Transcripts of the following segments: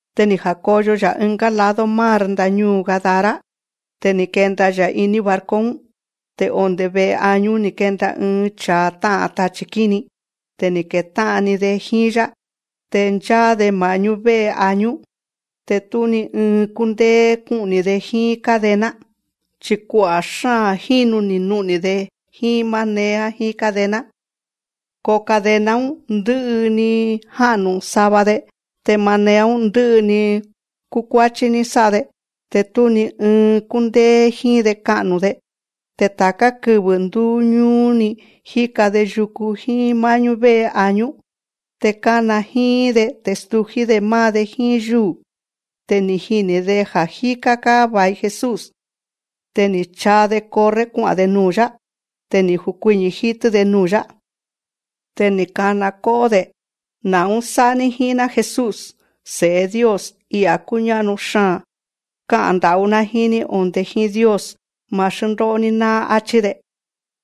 Te ni̱ ja̱koyo‑ya̱ ɨngá lado mar ndañúu̱ Gadara. Te ni̱ kenda‑ya̱ iní barco‑ún. Te onde̱ ve'e añú ni̱ kenda ɨɨn cha̱a tá'a̱n tachi̱ kíni, te ni̱ ketá'an‑ni‑de jíín‑yá. Te ncháá‑de ma̱'ñú vé'e añú. Te tú ni ɨɨn kúndéé kú'ni̱‑de jíín cadena. Chi̱ kua'a̱ xáa̱n jínu ni̱ nu'ni̱‑de jíín manea jíín cadena. Ko cadena‑ún, ndɨ'ɨ‑ni ni̱ ja'nu̱ sava‑de. Te manea‑ún, ndɨ'ɨ‑ni ni̱ kukuáchí ní sá'a‑de. Te tú ni ɨɨn kúndéé jíín‑de ka'nu̱‑de. Te ta̱ká kɨvɨ̱ ndúú ñúú‑ni jíka‑de yuku jíín má'ñú vé'e añú. Te kána jíín‑de, te stují‑dé máá‑de jíín yúu̱. Te ni̱ jini̱‑de ja̱ á jíká‑ga̱ va̱i Jesús. Te ni̱ chaa‑de corre kua'a̱n‑de nuu̱‑yá. Te ni̱ jukuiñi̱ jítɨ́‑de nuu̱‑yá. Te ni̱ kana kó'ó‑de: Na̱ún sá'a‑ní jíín‑ná Jesús, Se̱'e Dios, I'a̱ kúñá'nu xaa̱n. Ká'a̱n nda̱'ú‑ná jíín‑ní onde̱ jíín Dios, ma̱ xndó'o‑ní náá, áchí‑de.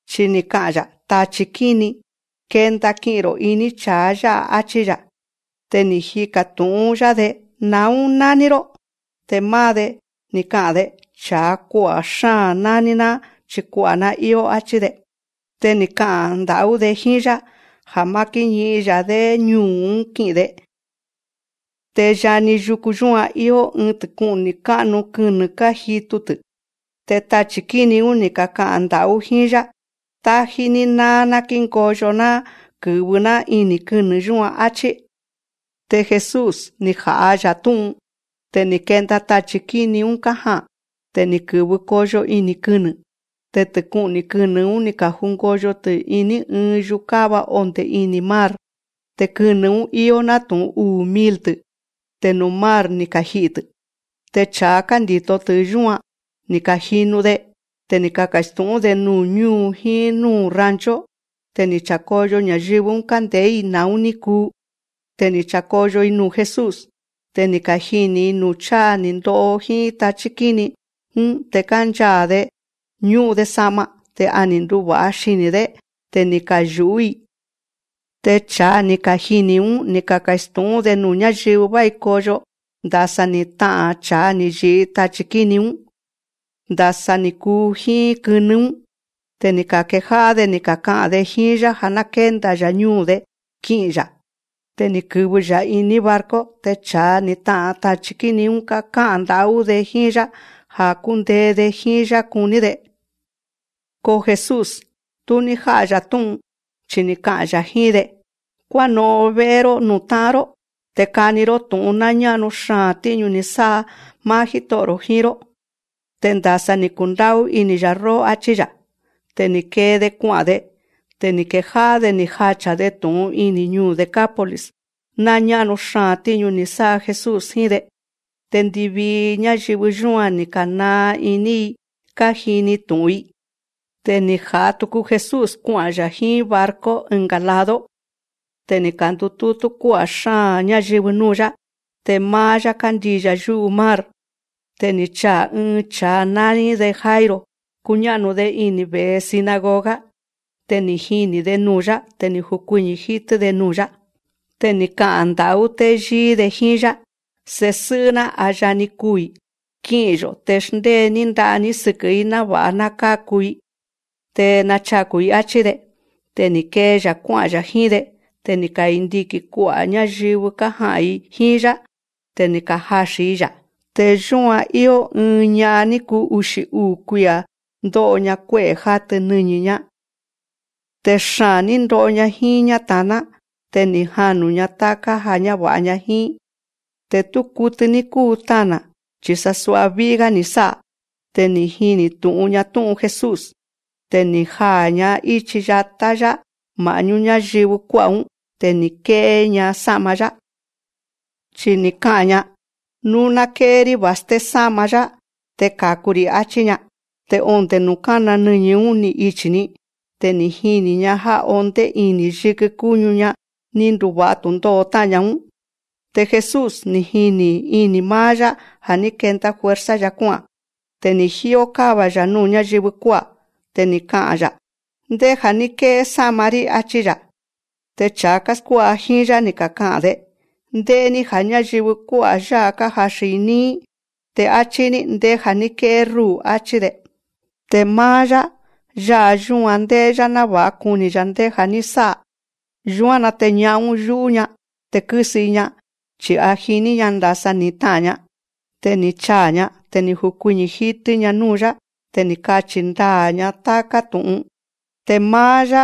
Chi ni̱ ka'a̱n‑ya̱: Tachi̱ kíni, kenda ki'i̱n‑ro̱ iní cha̱a yá'a, áchí‑ya̱. Te ni̱ jika̱ tu̱'ún‑yá‑de: Na̱ún nání‑ró. Te máá‑de, ni̱ ka'a̱n‑de: Cha̱a kua'a̱ xáa̱n nání‑ná, chi̱ kua'a̱‑ná íó, áchí‑de. Te ni̱ ka'a̱n nda̱'ú‑de jíín‑yá ja̱ má kíñi'in‑ya̱‑dé ñuu̱‑ún ki'i̱n‑de. Te yani yuku yúan íó ɨɨn tɨku'ni̱ ká'nu kɨnɨ̱ kájitu‑tɨ̱. Te tachi̱ kíni‑ún, ni̱ kaka'a̱n nda̱'ú jíín‑yá: Tájí‑ní náá ná kíngoyo‑ná kɨ̱vɨ‑ná ini̱ kɨnɨ̱ yúan, áchí. Te Jesús, ni̱ ja̱'a‑ya̱ tú'un. Te ni̱ kenda tachi̱ kíni‑ún kája'a̱n. Te ni̱ kɨ̱vɨ koyo ini̱ kɨnɨ̱. Te tɨku'ni̱ kɨnɨ̱‑ún, ni̱ ka̱jungoyo‑tɨ̱ ɨ́ɨn yukáva onde̱ ini̱ mar. Te kɨnɨ̱‑ún íó nátu̱'un uu̱ mil‑tɨ̱. Te nuu̱ mar ni̱ kaji'i̱‑tɨ̱. Te cha̱a kándi̱to‑tɨ̱ yúan, ni̱ ka̱jinu‑de. Te ni̱ kaka̱stu̱'ún‑de nuu̱ ñúu̱ jíín núu̱ rancho. Te ni̱ cha̱koyo ña̱yɨvɨ‑ún kánde̱'é‑i na̱ún ní kuu. Te ni̱ cha̱koyo‑i nuu̱ Jesús. Te ni̱ kajini̱‑i nuu̱ cháa ni̱ ndo'o jíín tachí kíni‑ún. Te kánchaa̱‑de, ñú'un‑de sa'ma, te a ni̱ nduva̱'a xini̱‑dé. Te ni̱ kayu̱'ú‑i. Te cha̱a ni̱ kajini̱‑ún, ni̱ kaka̱stu̱'ún‑de nuu̱ ñáyɨvɨ vái koyo ndasa ni̱ ta'a̱n cha̱a ni̱ yi̱'i tachi̱ kíni‑ún, te ndasa ni̱ kuu jíín kɨnɨ́‑ún. Te ni̱ ka̱kejá'á‑de ni̱ kaka'a̱n‑de jíín‑yá ja̱ ná kénda‑ya̱ ñúu̱‑de ki'i̱n‑ya̱. Te ni̱ kɨ̱vɨ‑ya̱ iní barco. Te cha̱a ni̱ ta'a̱n tachi̱ kíni‑ún ká'a̱n nda̱'ú‑de jíín‑yá, ja̱ kúndee‑de jíín‑yá kuní‑de. Ko Jesús, tú ní já'a‑ya̱ tú'un, chi ni̱ ka'a̱n‑ya̱ jíín‑de: Kuáno'on vé'e‑ró núu̱ tá'an‑ró. Te kani‑ró tú'un ná ñá'nu xaa̱n tíñu ni̱ sá'a máá Jíto'o̱‑ro̱ jíín‑ró, te ndasa ni̱ kundá'ú ini̱‑ya̱ róó, áchí‑ya̱. Te ni̱ kee‑de kua'a̱n‑de. Te ni̱ kejá'á‑de ni̱ jacha̱‑de tu̱'un ini̱ ñuu̱ Decápolis ná ñá'nu xaa̱n tíñu ni̱ sá'a Jesús jíín‑de. Te ndivii ñáyɨvɨ yúan, ni̱ ka̱naa iní‑i kájini tu̱'un‑i. Te ni̱ ja̱'a tuku Jesús kua'a̱n‑ya̱ jíín barco ɨnga̱ lado. Te ni̱ ka̱ndutútú kuá'a̱ xáa̱n ñáyɨvɨ núu̱‑yá. Te máá‑yá, kándii̱‑ya̱ yú'u mar. Te ni̱ chaa̱ ɨɨn cha̱a nání‑de Jairo kúñá'nu‑de ini̱ ve̱'e sinagoga. Te ni̱ jini̱‑de nuu̱‑yá. Te ni̱ jukuiñi̱ jítɨ́‑de nuu̱‑yá. Te ni̱ ka'a̱n nda̱'ú téyíí‑de jíín‑yá: Se̱sɨ́'ɨ́‑ná a yani kuu̱‑i. Ki'i̱n‑yo̱ te xndée‑ní nda'a‑ní sɨkɨ̱‑í náva̱'a ná káku‑i, te nachaku̱‑i, áchí‑de. Te ni̱ kee‑ya̱ kuá'a̱n‑ya̱ jíín‑de. Te ni̱ kandiki̱n kua'a̱ ñáyɨvɨ kája'a̱n‑i jíín‑yá. Te ni̱ kajaxi̱n‑i‑ya̱. Te yúan íó ɨɨn ña'an ní kuu uxi̱ uu̱ kuia̱ ndó'o‑ña kué'e̱ játɨ nɨñi̱‑ñá. Te xaa̱n ní ndo'o‑ña jíín ñáta̱ná. Te ni̱ janu̱‑ña táká ja̱ ñáva̱'a‑ña jíín. Te tú kutɨ ní kúu tana̱, chi̱ sasua ví'í‑gá ni̱ sá'a. Te ni̱ jini tu̱'un‑ña tú'un Jesús. Te ni̱ jaa̱‑ña íchi yatá‑yá ma̱'ñú ñáyɨvɨ kuá'a̱‑ún. Te ni̱ ké'é‑ña sá'ma‑yá. Chi ni̱ ka'a̱n‑ña: Nú ná ké'é‑rí va̱sté sá'ma‑yá, te ka̱ku‑ri̱. Achí‑ña. Te onde̱ nuu̱ kána nɨñi̱‑ñá‑ún, ni̱ ichi̱‑ni. Te ni̱ jini̱‑ña já ondé ini̱ yikɨ kúñu‑ña ní nduva̱'a tu̱ndó'o tá'a̱n‑ña‑ún. Te Jesús, ni̱ jini̱‑ni ini̱ máá‑yá ja̱ ní kenda fuerza‑ya̱ kuá'a̱n. Te ni̱ jíó káva‑ya̱ núu̱ ñáyɨvɨ kuá'a̱. Te ni̱ ka'a̱n‑ya̱: Ndéja̱ ní ké'é sá'ma‑rí, áchí‑ya̱. Te cha̱a káskuá'a jíín‑yá, ni̱ kaka'a̱n‑de: Ndé'é‑ní ja̱ ñáyɨvɨ kuá'a̱ yá'a kájaxi̱n‑i níí, te áchí‑ní: Ndéja̱ ní ké'é rúu̱, áchí‑de. Te máá‑yá, yá'a yúan ndé'é‑yá náva̱'a kuni̱‑ya̱ ndéja̱ ní sá'a. Yúan‑na te ña'an‑ún, yú'ú‑ña te kɨ́sɨ‑i‑ña, chi̱ a jiní‑ña ndasa ni̱ ta'a̱n‑ña. Te ni̱ chaa̱‑ña. Te ni̱ jukuiñi̱ jítɨ́‑ña núu̱‑yá. Te ni̱ kachi̱ ndaa̱‑ña táká tu̱'un. Te máá‑yá,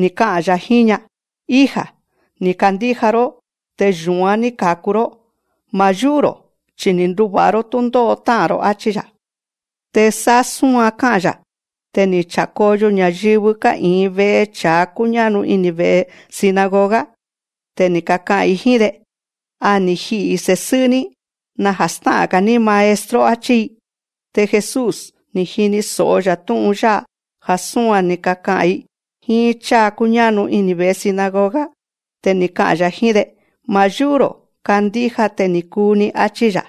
ni̱ ka'a̱n‑ya̱ jíín‑ña: Hija, ni̱ kandíja‑ró te yu̱án ní ka̱ku‑ró. Ma̱ yú'ú‑ro̱, chi ni̱ nduva̱'a‑ró túndó'o tá'a̱n‑ro̱, áchí‑ya̱. Te sá súan ká'a̱n‑ya̱, te ni̱ cha̱koyo ña̱yɨvɨ ká'i̱in ve'e cha̱a kúñá'nu ini̱ ve̱'e sinagoga, te ni̱ kaka'a̱n‑i jíín‑de: A ni̱ ji'i̱ se̱sɨ́'ɨ́‑ní. Naja̱ stá'a̱n‑ga̱‑ní Maestro, áchí‑i. Te Jesús, ni̱ jini so̱'o‑ya̱ tú'un yá'a ja̱ súan ni̱ kaka'a̱n‑i jíín cháa kúñá'nu ini̱ ve̱'e sinagoga. Te ni̱ ka'a̱n‑ya̱ jíín‑de: Ma̱ yú'ú‑ro̱. Kandíja te ni̱ kuu‑ni, áchí‑ya̱.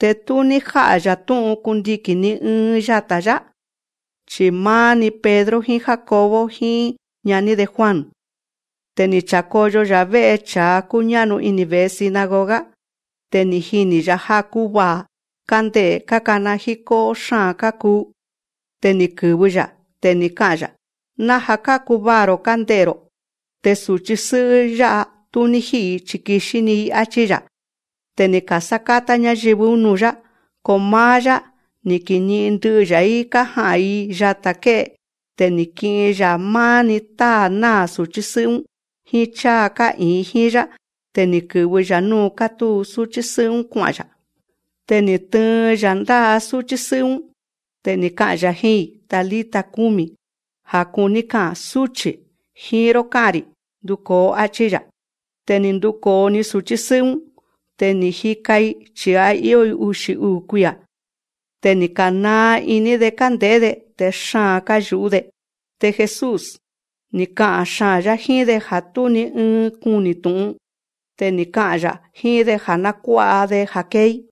Te tú ní já'a‑ya̱ tú'un kundiki̱n ni ɨɨn yata̱‑yá, chi̱ máá‑ni Pedro jíín Jacobo jíín ñaní‑de Juan. Te ni̱ cha̱koyo‑ya̱ vé'e cha̱a kúñá'nu ini̱ ve̱'e sinagoga. Te ni̱ jini̱‑ya̱ já kúvaa̱, kánde'e̱, kákana jíkó'ó xáa̱n kákuu. Te ni̱ kɨ̱vɨ‑ya̱. Te ni̱ ka'a̱n‑ya̱: Naja̱ kákuvaa̱‑ro̱ kánde'e̱‑ro̱. Te su̱chí sɨ́'ɨ́ yá'a, tú ní jí'i̱‑i, chi̱ kixí‑ni‑i, áchí‑ya̱. Te ni̱ ka̱sákátá ñáyɨvɨ‑ún nuu̱‑yá. Ko máá‑yá, ni̱ kiñi'in ndɨ'ɨ‑ya̱‑í kája'a̱n‑i yata̱ ké'e. Te ni̱ ki'in‑ya̱ máá‑ni táa̱ náa̱ su̱chí sɨ́'ɨ́‑ún, jíín cháa ká'i̱in jíín‑yá, te ni̱ kɨ̱vɨ‑ya̱ núu̱ kátúu súchí sɨ́'ɨ́‑ún kua'a̱n‑ya̱. Te ni̱ tɨɨn‑ya̱ ndá'a súchí sɨ́'ɨ́‑ún. Te ni̱ ka'a̱n‑ya̱ jíín‑i: Talita cumi, ja̱ kuní ka'a̱n: Súchi̱, jíín‑ró ká'a̱n‑ri̱, nduko̱o, áchí‑ya̱. Te ni̱ nduko̱o‑ni su̱chí sɨ́'ɨ́‑ún. Te ni̱ jika‑i, chi̱ a íó‑i uxi̱ uu̱ kuia̱. Te ni̱ ka̱naa iní‑de kánde̱'é‑de, te xaa̱n káyu̱'ú‑de. Te Jesús, ni̱ ka'a̱n xaa̱n‑yá jíín‑de ja̱ tú ni ɨɨn kuni tu̱'un. Te ni̱ ka'a̱n‑ya̱ jíín‑de ja̱ ná kuá'a‑de ja̱ kée‑í.